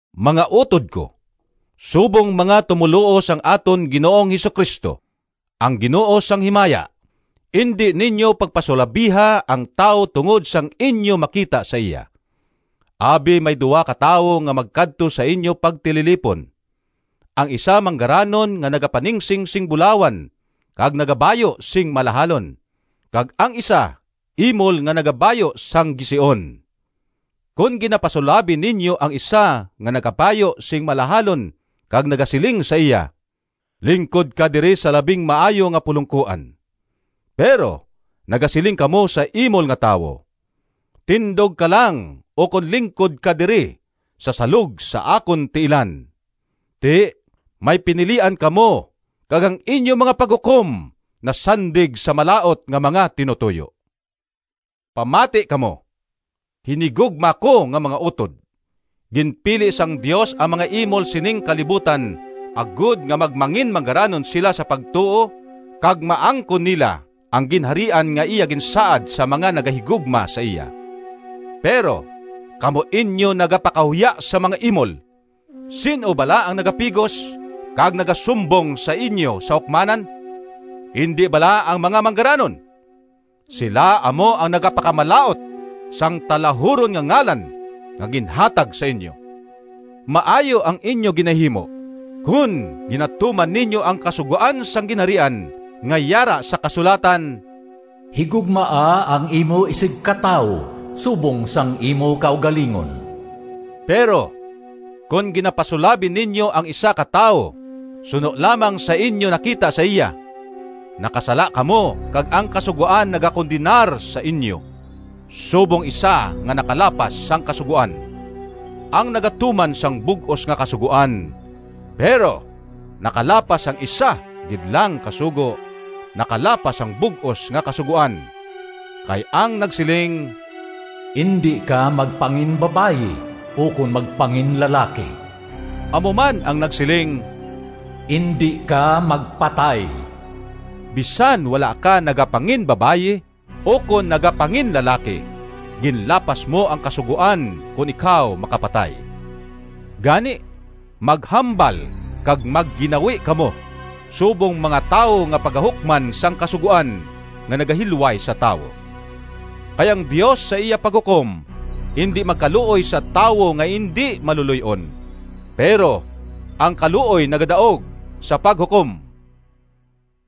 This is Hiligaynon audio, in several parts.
Mga utod ko! Subong mga tumoluo sang aton Ginoong Jesu-Cristo, ang Ginoo sang himaya, indi ninyo pagpasulabiha ang tawo tungod sang inyo makita sa iya. Abi may duha ka tawo nga magkadto sa inyo pagtililipon: ang isa manggaranon nga nagapaningsing sing bulawan kag nagabayu sing malahalon, kag ang isa imol nga nagabayu sang gision. Kon ginapasulabi ninyo ang isa nga nakabayu sing malahalon kag nagasiling sa iya, “Lingkod ka diri sa labing maayo nga pulongkoan,” pero nagasiling kamo sa imol nga tawo, “Tindog ka lang ukon lingkod ka diri sa salog sa akon tiilan,” ti may pinilian kamo kag ang inyo mga paghukom nasandig sa malaut nga mga tinutoyo. Pamati kamo, hinigugma ko nga mga utod! Ginpili sang Dios ang mga imol sining kalibutan agod nga magmanginmanggaranon sila sa pagtuo, kag maangkon nila ang Ginharian nga iya ginsaad sa mga nagahigugma sa iya. Pero kamo inyo nagapakahuya sa mga imol! Sin-o bala ang nagapigos kag nagasumbong sa inyo sa hukmanan? Indi bala ang mga manggaranon? Sila amo ang nagapakamalaut sang talahuron nga ngalan nga ginhatag sa inyo. Maayo ang inyo ginahimo kon ginatuman ninyo ang kasugoan sang Ginharian, nga yara sa kasulatan, “Higugmaa ang imo isigkatawo subong sang imo kaugalingon.” Pero kon ginapasulabi ninyo ang isa ka tawo suno lamang sa inyo nakita sa iya, nakasala kamo kag ang Kasugoan nagakondenar sa inyo subong isa nga nakalapas sang kasugoan. Ang nagatuman sang bug-os nga Kasugoan, pero nakalapas sang isa gid lang ka sugo, nakalapas sang bug-os nga Kasugoan. Kay ang nagsiling, “Indi ka magpanginbabayi ukon magpanginlalaki,” amo man ang nagsiling, “Indi ka magpatay.” Bisan wala ka nagapanginbabayi ukon nagapanginlalaki, ginlapas mo ang kasugoan kon ikaw makapatay. Gani maghambal kag magginawi kamo subong mga tawo nga pagahukman sang kasugoan nga nagahilway sa tawo. Kay ang Dios sa iya paghukom indi magkaluoy sa tawo nga indi maluloy-on, pero ang kaluoy nagadaog sa paghukom.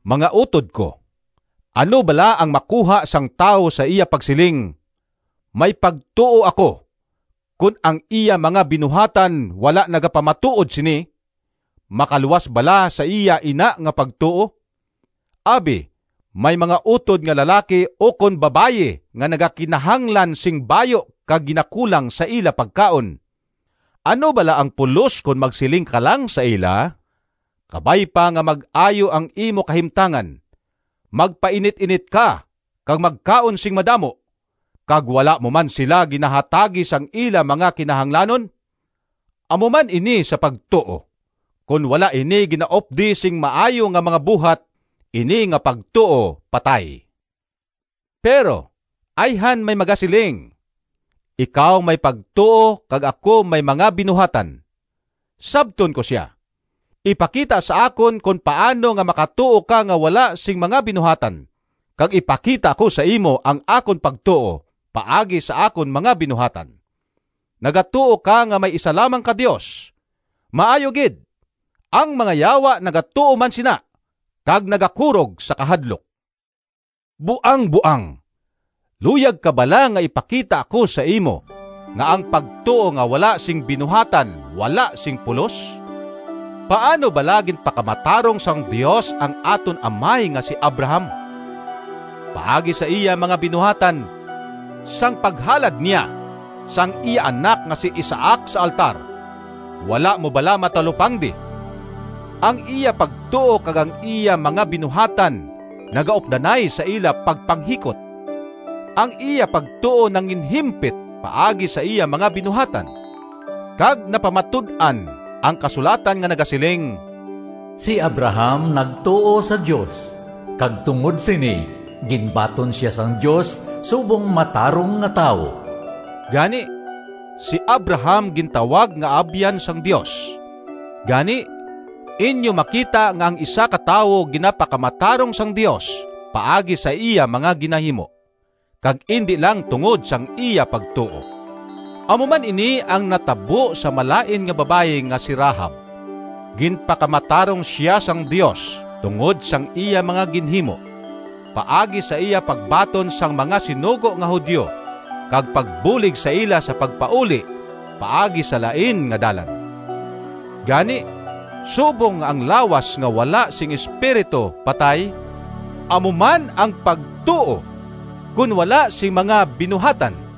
Mga utod ko! Ano bala ang makuha sang tawo sa iya pagsiling, “May pagtuo ako,” kon ang iya mga binuhatan wala nagapamatuod sini? Makaluwas bala sa iya ina nga pagtuo? Abi may mga utod nga lalaki ukon babayi nga nagakinahanglan sing bayu kag ginakulang sa ila pagkaon, ano bala ang pulos kon magsiling ka lang sa ila, “Kabay pa nga mag-ayo ang imo kahimtangan! Magpainit-init ka kag magkaon sing madamo,” kag wala mo man sila ginahatagi sang ila mga kinahanglanon? Amo man ini sa pagtuo: kon wala ini ginaupdi sing maayo nga mga buhat, ini nga pagtuo patay. Pero ayhan may magasiling, “Ikaw may pagtuo kag ako may mga binuhatan.” Sabton ko sia, “Ipakita sa akon kon paano nga makatuo ka nga wala sing mga binuhatan kag ipakita ko sa imo ang akon pagtuo paagi sa akon mga binuhatan.” Nagatuo ka nga may isa lamang ka Dios! Maayo gid! Ang mga yawa nagatuo man sina kag nagakurog sa kahadlok. Buangboang! Luyag ka bala nga ipakita ko sa imo nga ang pagtuo nga wala sing binuhatan wala sing pulos? Paano bala ginpakamatarong sang Dios ang aton amay nga si Abraham? Paagi sa iya mga binuhatan, sang paghalad niya sang iya anak nga si Isaac sa altar. Wala mo bala matalupangdi? Ang iya pagtuo kag ang iya mga binuhatan nagaupdanay sa ila pagpanghikot. Ang iya pagtuo nanginhimpit paagi sa iya mga binuhatan. Kag napamatud-an ang kasulatan nga nagasiling, “Si Abraham nagtuo sa Dios, kag tungod sini ginbaton sia sang Dios subong matarong nga tawo.” Gani si Abraham gintawag nga abyan sang Dios. Gani, inyo makita nga ang isa ka tawo ginapakamatarong sang Dios paagi sa iya mga ginahimo, kag indi lang tungod sang iya pagtuo. Amo man ini ang natabo sa malain nga babayi nga si Rahab. Ginpakamatarong sia sang Dios tungod sang iya mga ginhimo, paagi sa iya pagbaton sang mga sinugo nga Judio kag pagbulig sa ila sa pagpauli paagi sa lain nga dalan. Gani, subong nga ang lawas nga wala sing espiritu patay, amo man ang pagtuo kon wala sing mga binuhatan.